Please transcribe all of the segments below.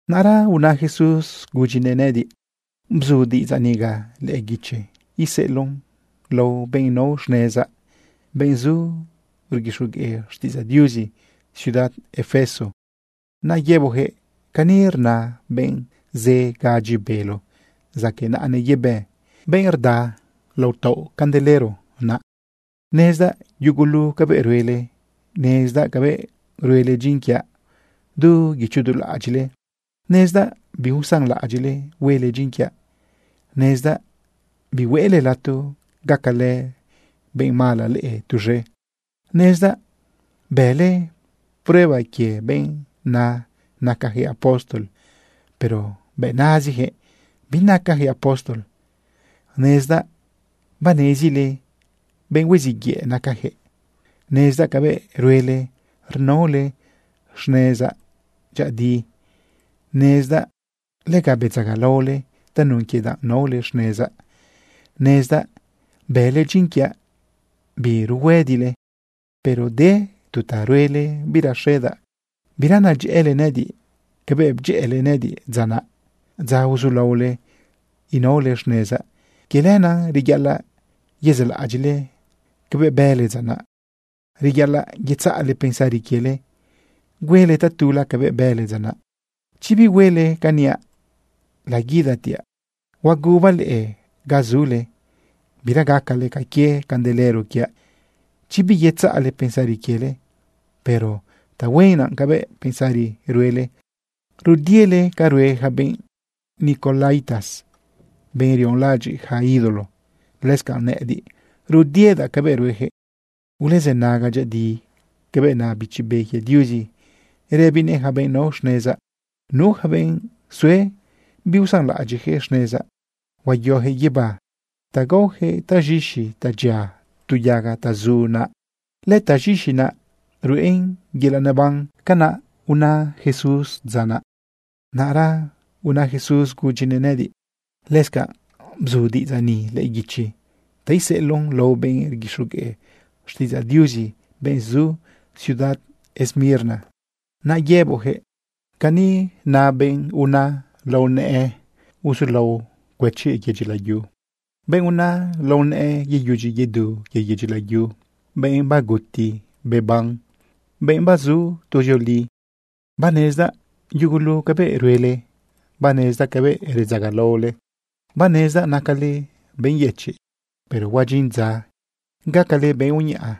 Naꞌra una Jesús gudyinëꞌ nëꞌëdiꞌ: ―Bzu diꞌidzaꞌ niga lëꞌë guichi iseꞌeloꞌn lao benꞌ nao xnezaꞌ, benꞌ zu rguixogueꞌ xtiꞌidzaꞌ Diuzi ciudad Efeso. Naꞌ yëboꞌjëꞌ: “Cani rna benꞌ zë gadyi bélo zaqueꞌ naꞌanëꞌ yebë, benꞌ rda lao taoꞌ candelero naꞌ: Nezdaꞌ yugulu cabëꞌ ruele. Nezdaꞌ cabëꞌ ruele dyin quiaꞌ du guicho du laꞌadyiꞌle. Nezdaꞌ biusanlaꞌadyiꞌle huele dyin quiaꞌ. Nezdaꞌ bihueꞌle lato gacalë benꞌ mala leꞌe tuz̃e. Nezdaꞌ bële prueba quie benꞌ na nacajëꞌ apóstol, pero bëꞌ nazijëꞌ binacajëꞌ apóstol. Nezdaꞌ banezile benꞌ huiziꞌ yëꞌ nacajëꞌ. Nezdaꞌ cabëꞌ ruele rnaole xnezaꞌ dyëꞌëdi. Nezdaꞌ lega bedzagalaole tanun quie danꞌ naole xnezaꞌ. Nezdaꞌ bële dyin quiaꞌ biruhuëdile. Pero de tu ta ruele biraxedaꞌ. Bira nedyëꞌële nëꞌëdiꞌ cabëꞌ bdyëꞌële nëꞌëdiꞌ dza naꞌ, dza uzulaole inaole xnezaꞌ. Quie lenaꞌ reyaꞌalaꞌ yezaꞌlaꞌadyiꞌle cabëꞌ bële dza naꞌ. Reyaꞌalaꞌ yetzaꞌle pensari quiele huele tatula cabëꞌ bële dza naꞌ. Chi bihuele ca niaꞌ, laguidatiaꞌ huagubaꞌ leꞌe ga zule, bira gacale ca quie candelero quiaꞌ chi biyetzaꞌle pensari quiele. Pero tahuen naꞌ cabëꞌ pensari ruele rudiele ca rue ja benꞌ nicolaítas, benꞌ rionlaꞌadyiꞌ yaca ídolo. Lëscanꞌ nëꞌëdiꞌ, rudiedaꞌ cabëꞌ ruejëꞌ. Ulezënaga dyëꞌëdi cabëꞌ na Bichi Be quie Diuzi rëbinëꞌ yaca benꞌ nao xnezaꞌ. Nu yaca benꞌ sue biusanlaꞌadyiꞌ xnezaꞌ, huayojëꞌ guibá ta gaojëꞌ taz̃ixi ta dyia tu yaga ta zu naꞌ. Lëtaz̃ixi naꞌ ruꞌen yelaꞌ neban.” ―Canaꞌ una Jesús dza naꞌ. Naꞌra una Jesús gudyinëꞌ nëꞌëdiꞌ: ―Lëscanꞌ bzu diꞌidzaꞌ niga lëꞌë guichi ta iseꞌeloꞌn lao benꞌ rguixogueꞌ xtiꞌidzaꞌ Diuzi, benꞌ zu ciudad Esmirna. Naꞌ yëboꞌjëꞌ: “Cani na benꞌ una lao nëꞌë uzulao cuëchi yedyi layu, benꞌ una lao nëꞌë yeyudyi yedu quie yedyi layu, benꞌ baguti beban, benꞌ bazu tuzioli: Banezdaꞌ yugulu cabëꞌ ruele. Banezdaꞌ cabëꞌ redzagalaole. Banezdaꞌ nacale benꞌ yëchiꞌ, pero huadyin dza gacale benꞌ uñaꞌa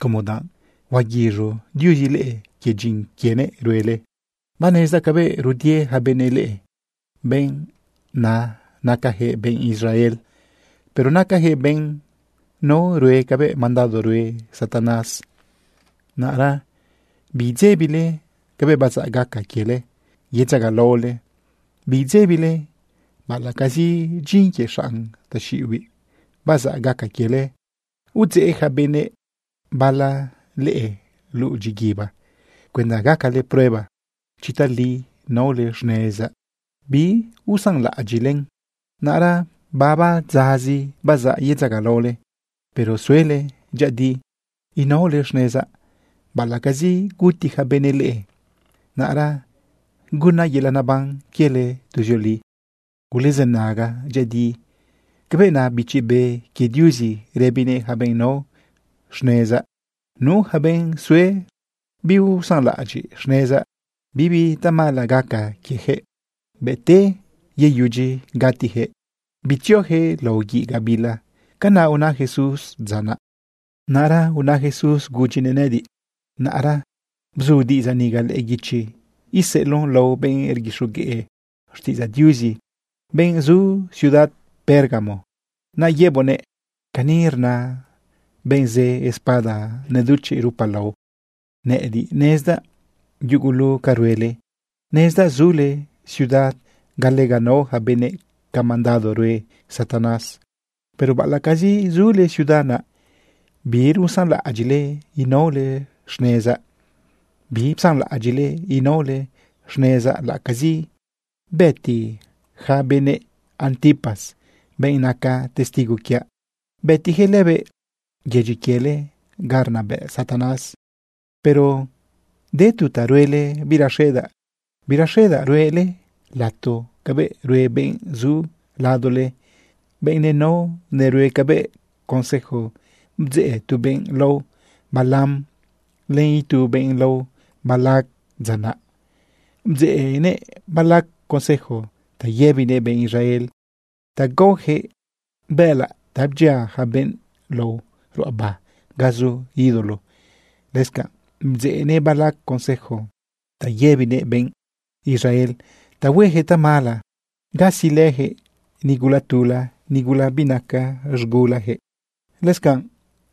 como danꞌ huaguiz̃u Diuzi leꞌe quie dyin quienëꞌ ruele. Banezdaꞌ cabëꞌ rudie ja benëꞌ leꞌe, benꞌ na nacajëꞌ benꞌ Israel, pero nacajëꞌ benꞌ nao rue cabëꞌ mandado rue Satanás. Naꞌra biidzebile cabëꞌ bazaꞌ gaca quiele yedzagalaole. Biidzebile baꞌalaꞌcazi dyin quie xanꞌ taxiꞌibiꞌ bazaꞌ gaca quiele udzeꞌ ja benëꞌ bala leꞌe luꞌu dyiguiba cuenda gacale prueba chi tali naole xnezaꞌ biusanlaꞌadyiꞌlen. Naꞌra baba dzazi bazaꞌ yedzagalaole. Pero suele dyëꞌëdi inaole xnezaꞌ baꞌalaꞌcazi guti ja benëꞌ leꞌe. Naꞌra gunaꞌ yelaꞌ neban quiele tuzioli. Ulezënaga dyëꞌëdi cabëꞌ na Bichi Be quie Diuzi rëbinëꞌ yaca benꞌ nao xnezaꞌ. Nu yaca benꞌ sue biusanlaꞌadyiꞌ xnezaꞌ, bibi tamala gaca quiejëꞌ, ude beyudyi gutijëꞌ, bitziojëꞌ lao guiꞌ gabila.” ―Canaꞌ una Jesús dza naꞌ. Naꞌra una Jesús gudyinëꞌ nëꞌëdiꞌ: ―Naꞌra bzu diꞌidzaꞌ niga lëꞌë guichi iseꞌeloꞌn lao benꞌ rguixogueꞌ xtiꞌidzaꞌ Diuzi, benꞌ zu ciudad Pérgamo. Naꞌ yëboꞌnëꞌ: “Cani rna benꞌ zë espada neduchiꞌ rupalao: Nëꞌëdiꞌ nezdaꞌ yugulu ca ruele. Nezdaꞌ zule ciudad ga lega nao ja benëꞌ ca mandado rue Satanás. Pero baꞌalaꞌcazi zule ciudad naꞌ, birusanlaꞌadyiꞌle inaole xnezaꞌ. Bipsanlaꞌadyiꞌle inaole xnezaꞌ laꞌacazi bëti ja benëꞌ Antipas, benꞌ naca testigo quiaꞌ. Bëtijëꞌ lëbëꞌ yedyi quiele ga rnabëꞌ Satanás. Pero de tu ta ruele biraxedaꞌ. Biraxedaꞌ ruꞌele lato cabëꞌ rue benꞌ zu ladole, benꞌ nenao nerue cabëꞌ consejo bdzeꞌ tu benꞌ lao Balaam len itu benꞌ lao Balac dza naꞌ. Bdzeꞌnëꞌ Balac consejo ta yëbinëꞌ benꞌ Israel ta gaojëꞌ bëꞌëlaꞌ ta bdyia ja benꞌ lao ruꞌaba ga zu ídolo. Lëscanꞌ bdzeꞌnëꞌ Balac consejo ta yëbinëꞌ benꞌ Israel ta huejëꞌ tamala gatilëjëꞌ nigula tula, nigula binaca z̃gulajëꞌ. Lëscanꞌ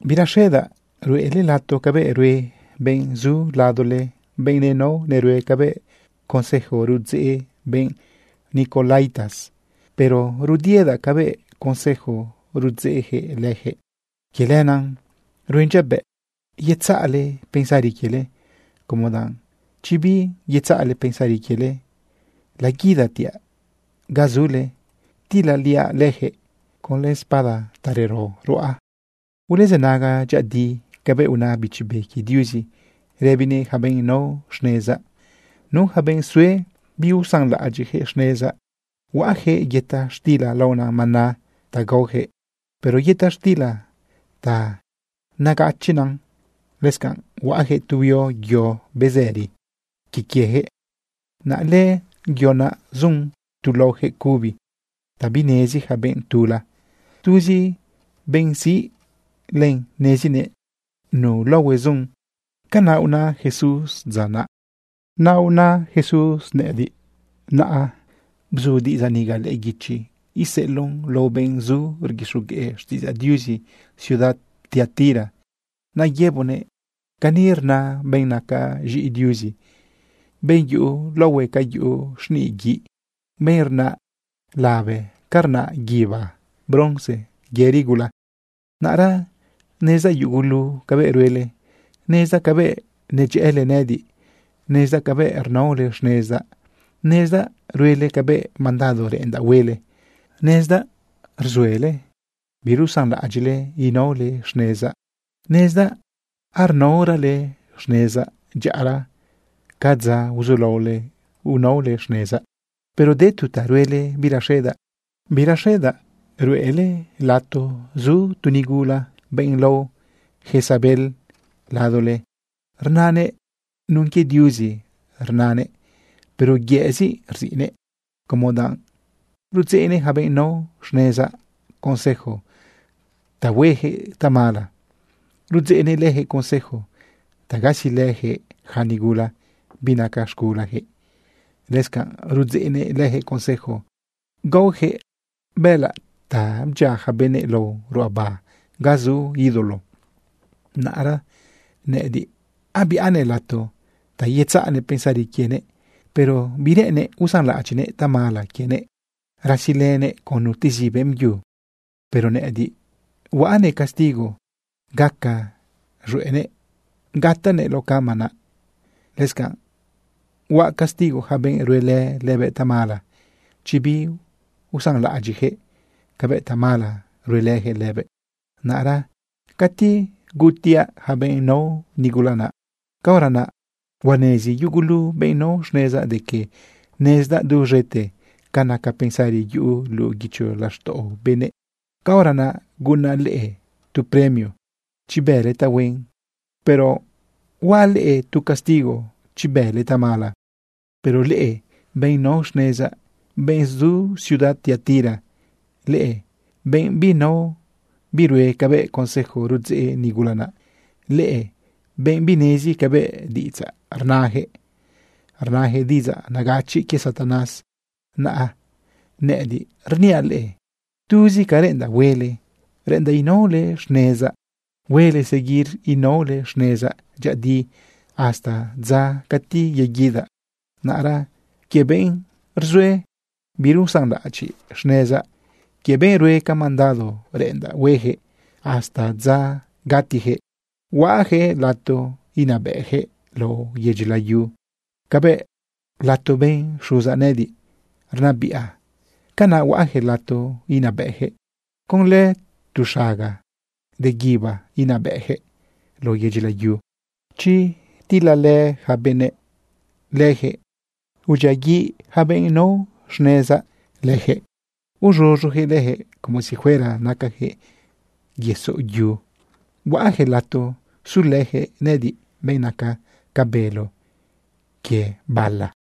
biraxedaꞌ ruꞌele lato cabëꞌ rue benꞌ zu ladole, benꞌ nenao nerue cabëꞌ consejo rudzeꞌ benꞌ nicolaítas. Pero rudiedaꞌ cabëꞌ consejo rudzeꞌjëꞌ leyaquëꞌ. Quie lenaꞌ ruen dyabëꞌ yetzaꞌle pensari quiele, como danꞌ chi biyetzaꞌle pensari quiele, laguidatiaꞌ ga zule tilaliaꞌ lëjëꞌ conlë espada ta rero ruꞌa. Ulezënaga dyëꞌëdi cabëꞌ na Bichi Be quie Diuzi rëbinëꞌ yaca benꞌ nao xnezaꞌ. Nu yaca benꞌ sue biusanlaꞌadyiꞌ xnezaꞌ, huaꞌjëꞌ yëta xtila laona maná ta gaojëꞌ, pero yëta xtila ta negachiꞌn naꞌ. Lëscanꞌ huaꞌjëꞌ tu huio yo bezëri quie quiejëꞌ. Naꞌ lëꞌë yo naꞌ zun tu laojëꞌ cubi ta binezi ja benꞌ tula. Tuzi benꞌ siꞌ len nezinëꞌ nu laohue zun.” ―Canaꞌ una Jesús dza naꞌ. Naꞌra una Jesús gudyinëꞌ nëꞌëdiꞌ: ―Naꞌra bzu diꞌidzaꞌ niga lëꞌë guichi iseꞌeloꞌn lao benꞌ zu rguixogueꞌ xtiꞌidzaꞌ Diuzi ciudad Tiatira. Naꞌ yëboꞌnëꞌ: “Cani rna benꞌ naca z̃iꞌi Diuzi, benꞌ yuꞌu laohue ca yuꞌu xniꞌ guiꞌ, benꞌ rnaꞌ labe ca rnaꞌ guibá bronce yëri gula: Naꞌra nezdaꞌ yugulu cabëꞌ ruele. Nezdaꞌ cabëꞌ nedyëꞌële nëꞌëdiꞌ. Nezdaꞌ cabëꞌ rnaole xnezaꞌ. Nezdaꞌ ruele cabëꞌ mandado reꞌendaꞌ huele. Nezdaꞌ rzuele birusanlaꞌadyiꞌle inaole xnezaꞌ. Nezdaꞌ arnaorale xnezaꞌ dyaꞌara ca dza uzulaole inaole xnezaꞌ. Pero de tu ta ruele biraxedaꞌ. Biraxedaꞌ ruꞌele lato zu tu nigula, benꞌ lao Jezabel, ladole. Rnanëꞌ nun quie Diuzi rnanëꞌ, pero yëꞌzi rziꞌnëꞌ, como danꞌ rudzeꞌnëꞌ ja benꞌ nao xnezaꞌ consejo ta huejëꞌ tamala. Rudzeꞌnëꞌ lëjëꞌ consejo ta gasilëjëꞌ yaca nigula binaca z̃gulajëꞌ. Lëscanꞌ rudzeꞌnëꞌ lëjëꞌ consejo gaojëꞌ bëꞌëlaꞌ ta bdyia ja benëꞌ lao ruꞌaba ga zu ídolo. Naꞌra nëꞌëdiꞌ abiꞌanëꞌ lato ta yetzaꞌnëꞌ pensari quienëꞌ, pero bireꞌennëꞌ usanlaꞌadyiꞌnëꞌ tamala quienëꞌ rasilënëꞌ con nutezi beꞌmbyu. Pero nëꞌëdiꞌ huaꞌnëꞌ castigo gaca z̃hueꞌnëꞌ gatanëꞌ lao cama naꞌ. Lëscanꞌ huaꞌ castigo ja benꞌ ruelë lëbëꞌ tamala chi biusanlaꞌadyiꞌjëꞌ cabëꞌ tamala ruelëjëꞌ lëbëꞌ. Naꞌra cati gutiaꞌ ja benꞌ nao nigula naꞌ, caora naꞌ huanezi yugulu benꞌ nao xnezaꞌ de que nezdaꞌ duz̃ete ca naca pensari yuꞌu luꞌu guicho laxtaꞌo benëꞌ. Caora naꞌ gunaꞌ leꞌe tu premio chi bële tahuen, pero huaꞌ leꞌe tu castigo chi bële tamala. Pero leꞌe, benꞌ nao xnezaꞌ, benꞌ zu ciudad Tiatira, leꞌe benꞌ binao birue cabëꞌ consejo rudzeꞌ nigula naꞌ, leꞌe benꞌ binezi cabëꞌ diꞌidzaꞌ rnajëꞌ, rnajëꞌ diꞌidzaꞌ negachiꞌ quie Satanás, naꞌ nëꞌëdiꞌ rniaꞌ leꞌe, tuzi ca reꞌendaꞌ huele, reꞌendaꞌ inaole xnezaꞌ. Huele seguir inaole xnezaꞌ dyëꞌëdi hasta dza cati yeguidaꞌ. Naꞌra quie benꞌ rzue birusanlaꞌadyiꞌ xnezaꞌ, quie benꞌ rue ca mandado reꞌendaꞌ huejëꞌ hasta dza gatijëꞌ, huaꞌjëꞌ lato inabëꞌjëꞌ lao yedyi layu. Cabëꞌ lato bën Xuzaꞌ nëꞌëdiꞌ rnabiꞌa, canaꞌ huaꞌjëꞌ lato inabëꞌjëꞌ. Conlë tu xagaꞌ de guíba inabëꞌjëꞌ lao yedyi layu. Chi tilalë ja benëꞌ lëjëꞌ, udyiaguiꞌ yaca benꞌ nao xnezaꞌ lëjëꞌ uz̃uz̃uyaquëꞌ lëjëꞌ como si fuera nacajëꞌ yesoꞌ yu. Huaꞌjëꞌ lato sulëjëꞌ nëꞌëdiꞌ, benꞌ naca ca bélo quie bala.